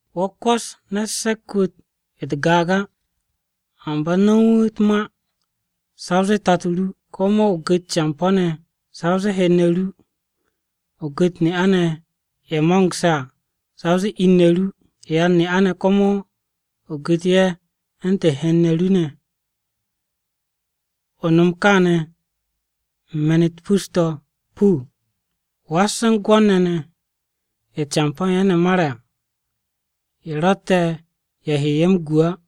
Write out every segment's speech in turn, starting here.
Wo̱ kwò̱s ne̱t se̱k-wu̱ u̱t-gaag á, amba nom wu̱ u̱t-ma sa o zee tato ru. Komo o gu̱t campo̱-ne̱ sa o zee hen-ne̱ ru. O gu̱t ne'a-ne̱ ye̱ mo̱ngse̱ à, sa o zee in-ne̱ ru. Yan-ne'a-ne̱ komo o gu̱t ye̱ u̱ntu̱n hen-ne̱ ru ne̱. O nom kaane̱ u̱n me̱n-u̱t pus-to̱ puu. Was u̱n gwo̱r-ne̱ ne̱, ye̱ campo̱ u̱n ye̱ ne̱ mare̱ à, ye̱ ro̱tte̱ ye̱ he ye̱ m-gwo̱t á.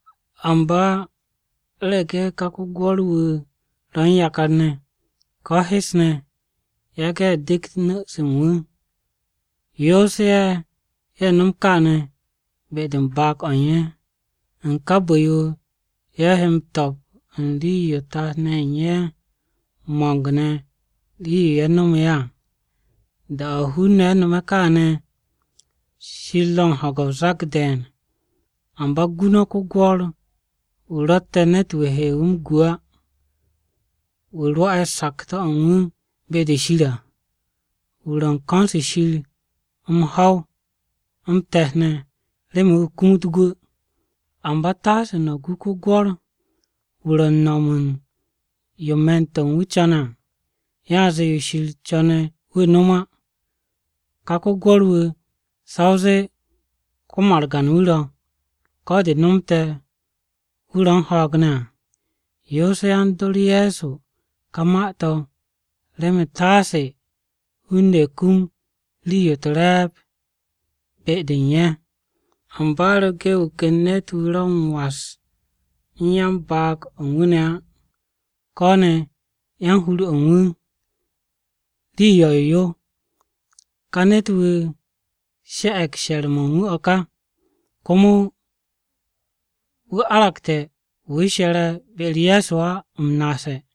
Amba u̱rege̱ ka ko-gwo̱r-wu̱ ro̱ u̱n yakar-ne̱, ko̱ ne̱ hes-ne̱, yage̱ ye̱ dekt nu̱-se u̱n wu̱. Yoose̱ ye̱, ye̱ nom kaane̱ be-de u̱n baag-o̱ u̱n ye̱. U̱n ka bu̱-yo, ye̱ he m-to̱p u̱n rii-yo tat-ne̱ ye̱ u̱n ye̱ ne̱ mo̱ng-ne̱ nomu̱ ye̱ à. Da-o̱ hun-ne̱ no̱me̱ kaane̱, Shir ro̱ u̱n ho̱ge̱ o-zak de̱e̱n. Amba gu no̱ ko-gwo̱r-wu̱ ro̱tte̱ ne̱t-wu̱ he wu̱ m-gu á. Wu̱ rwo̱'e̱ sakto̱-o̱ u̱n wu̱ be-de Shir à. Wu̱ ro̱ u̱n ko̱n-se Shir m-ho̱w, m-te̱t ne̱, remen wu̱ kumut gwu̱ à. Amba taase no̱ gu ko-gwo̱r-wu̱ ro̱ u̱n no̱m yo me̱n-to̱ u̱n wu̱ co̱ne̱ à, yanze yo Shir co̱ne̱ wu̱ no̱m á. Ka ko-gwo̱r-wu̱ sa o zee ko-margan-wu̱ ro̱, ko̱ de nomte̱ wu̱ ro̱ u̱n ho̱o̱g ne̱ à. Yoose̱ yan-dor Ye̱so ka ma-to̱ remen taase hun-ne̱ kum rii-yo u̱t-re̱e̱b be-de u̱n ye̱. Amba u̱rege̱ wu̱ ken ne̱t-wu̱ ro̱ u̱n was u̱n yan-baag-o̱ u̱n wu̱ ne̱ á, ko̱ ne̱ yan-hur-o̱ u̱n wu̱, rii yo̱-yo yo. Ka ne̱t-wu̱ she̱'e̱g she̱r-mo̱ u̱n wu̱ o̱ ka, komo wu̱ aragte̱ wu̱ she̱re̱ be-u̱r Ye̱so á m-naase̱.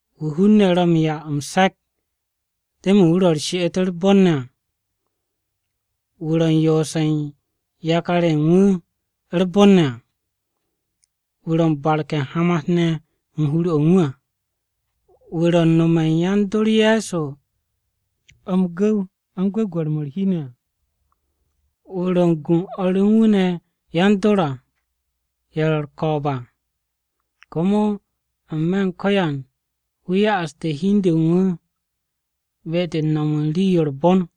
Wu̱ hun-ne̱ ro̱ u̱n 'ya m-se̱k remen wu̱ ro̱ m-no̱m rii-yo u̱r-bon à. Wu̱ ro̱ u̱n yoose̱ u̱n yakar-ye̱ u̱n wu̱ u̱r-bon ne̱ ne̱ à. Wu̱ ro̱ u̱n barke̱ u̱n hamat-ne̱ u̱n hur-o̱ u̱n wu̱ à. Wu̱ ro̱ u̱n nome̱ u̱n yan-dor Ye̱so m-gu̱w u̱n gwu̱gwe̱r-mo̱ u̱r-hi ne̱ à. Wu̱ ro̱ u̱n gu u̱n o̱r u̱n wu̱ ne̱ yan-dor à ye̱ ro̱ u̱r-ko̱o̱b à. Komo n-me̱ u̱n ko̱yan wu̱ ya'aste̱ hi u̱n du u̱n wu̱ be-de u̱n nom u̱n rii-yo u̱r-bon.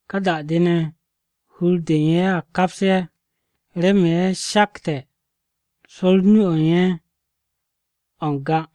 Ka da-de ne̱ hur-de u̱n ye̱ a kaps ye̱, remen ye̱ shakte̱ swo̱r o-nu o̱ u̱n ye̱ o̱ n-ga.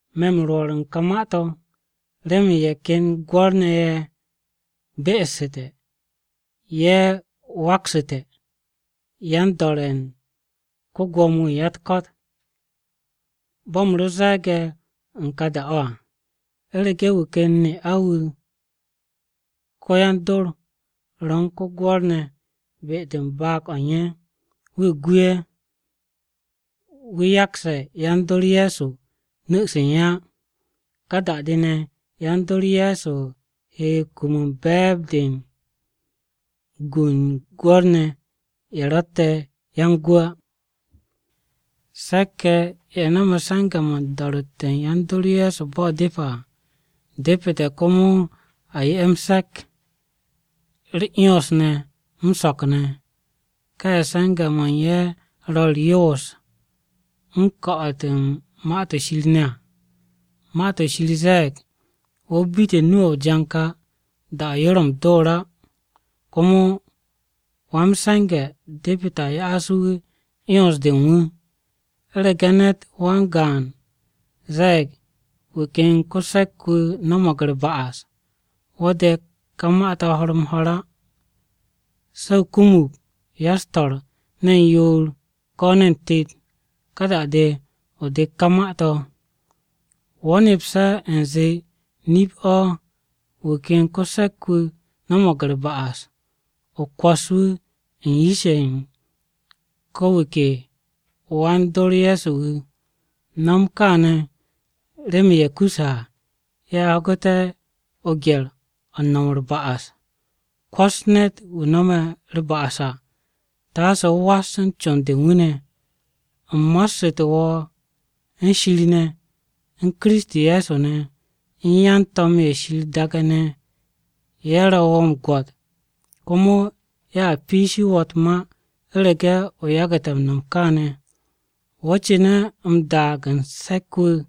Me̱ m-rwo̱r u̱n ka ma-to̱, remen ye̱ ken gwo̱r-ne̱ ye̱ be'essu̱te̱, ye̱ waktu̱ssu̱te̱, yan-do̱re̱ u̱n ko-Gwo̱mo-wu̱ u̱n ya-u̱t-ko̱t. Bo̱ u̱m ro ze̱e̱ge̱ u̱n ka da-o̱ à, u̱rege̱ wu̱ ken ne'a-wu̱ ko-yan-dor, ro̱ u̱n ko-gwo̱r ne̱ be-de u̱n baag-o̱ u̱n ye̱, wu̱ gu ye̱. Wu̱ yakse̱ yan-dor Ye̱so nu̱-se u̱n ye̱ á. Ka da-de ne̱ yan-dor Ye̱so he kum u̱n be̱e̱b-de u̱n gu u̱n gwo̱r-ne̱ ye̱ ro̱tte̱ yan-gwu̱ á. Se̱k-ye̱, ye̱ no̱me̱ se̱nge̱-mo̱ u̱n do̱ro̱tte̱ u̱n yan-dor Ye̱so bo̱ depe̱ à, depete̱ komo a 'ye ye̱ m-se̱k, u̱r-'yons ne̱ m-so̱k ne̱. Ka ye̱ se̱nge̱-mo̱ u̱n ye̱ ro̱ u̱r-yoos, u̱n ko̱'o̱t u̱n Ma-to̱ Shir ne̱ à. Ma-to̱ Shir ze̱e̱g, “Wo̱ bite̱ nu-o̱ o-janka da-de yo ro̱ m-door á.” Komo “Wa-m-se̱nge̱ depete̱ a ya'as wu̱ 'yons-de u̱n wu̱.” U̱rege̱ ne̱t wan-gaan ze̱e̱g wu̱ ken ko-se̱k-wu̱ no̱mo̱g u̱r-ba'as, wo̱ de̱k ka ma-to̱ ho̱r-m-ho̱r á. Se̱ o kumug ya-u̱s-to̱r, ne̱n yoor ko̱ ne̱n tet, ka da-de, o de̱kt ka ma-to̱. Wo̱ nepse̱ u̱nze nip-o̱ wu̱ ken ko-se̱k-wu̱ no̱mo̱g u̱r-ba'as, o kwo̱s wu̱ u̱n yish-ye̱ u̱n ko̱ wu̱ ke wan-dor Ye̱so wu̱. No̱m kaane̱ remen ye̱ kuse̱ à, ye̱ ho̱gu̱te̱ o-gye̱r o̱ u̱n no̱m u̱r-ba'as. Kwo̱s ne̱t-wu̱ no̱me̱ u̱r-ba'as à, taase o was u̱n con-de u̱n wu̱ ne̱. U̱m mo̱ssu̱te̱ wo̱ u̱n Shir ne̱, u̱n Kiristi Ye̱so ne̱, u̱n yan-to̱m ye̱ Shir ne̱, ye̱ ro̱ wo̱ m-gwo̱t komo ye̱a piishi wo̱ u̱t-ma u̱rege̱ o yagu̱te̱ m-no̱m kaane̱. Wo̱ cu̱ne̱ m-daag u̱n se̱k-wu̱,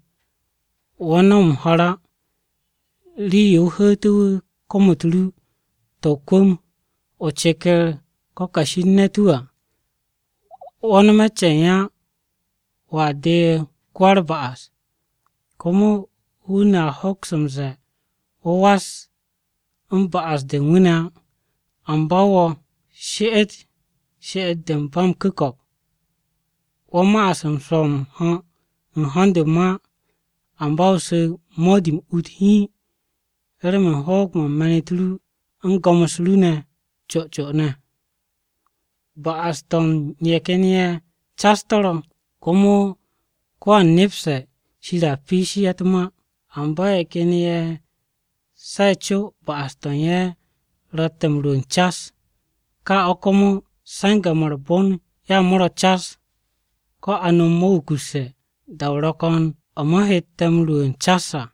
wo̱ no̱m m-ho̱r á. Rii-yo o hu̱u̱tu̱ wu̱ kom-u̱t ru to̱ o-kwu̱m, o ceker ko̱ kashi u̱n ne̱t-wu̱ à. Wo̱ nome̱ ce̱e̱n á, wo̱a deeg ko-wa-u̱r-ba'as. Komo hun-ne̱ a hoks m-ze̱e̱ wo̱ was u̱n ba'as-de u̱n wu̱ ne̱ á. Amba wo̱, she'et she'et-de u̱n ba m-ku̱ko̱p. Wo̱ ma'as u̱n swo̱ m-ho̱ u̱n ho̱n-de u̱n mo̱ á, amba o su̱ mo̱di-m ut hiin remen hoog-mo̱ me̱n-u̱t ru u̱n go̱m-u̱s ru ne̱ co co. Ba'as-to̱ u̱n ye̱ ken ye̱ cas to̱ ro̱, komo ko̱wan nepse̱ Shir a piishi ye̱ u̱t-ma. Amba ye̱ ken ye̱ se̱ o-co ba'as-to̱ u̱n ye̱ ro̱tte̱ m-rwu̱u̱n cas. Ka o̱ komo se̱nge̱-mo̱ u̱r-bon ya mo̱ ro̱ cas, ko̱ a nom mo̱ wukusse̱, da-o̱ ro̱ ko̱n o̱ mo̱ hette̱ m-rwu̱u̱n cas à.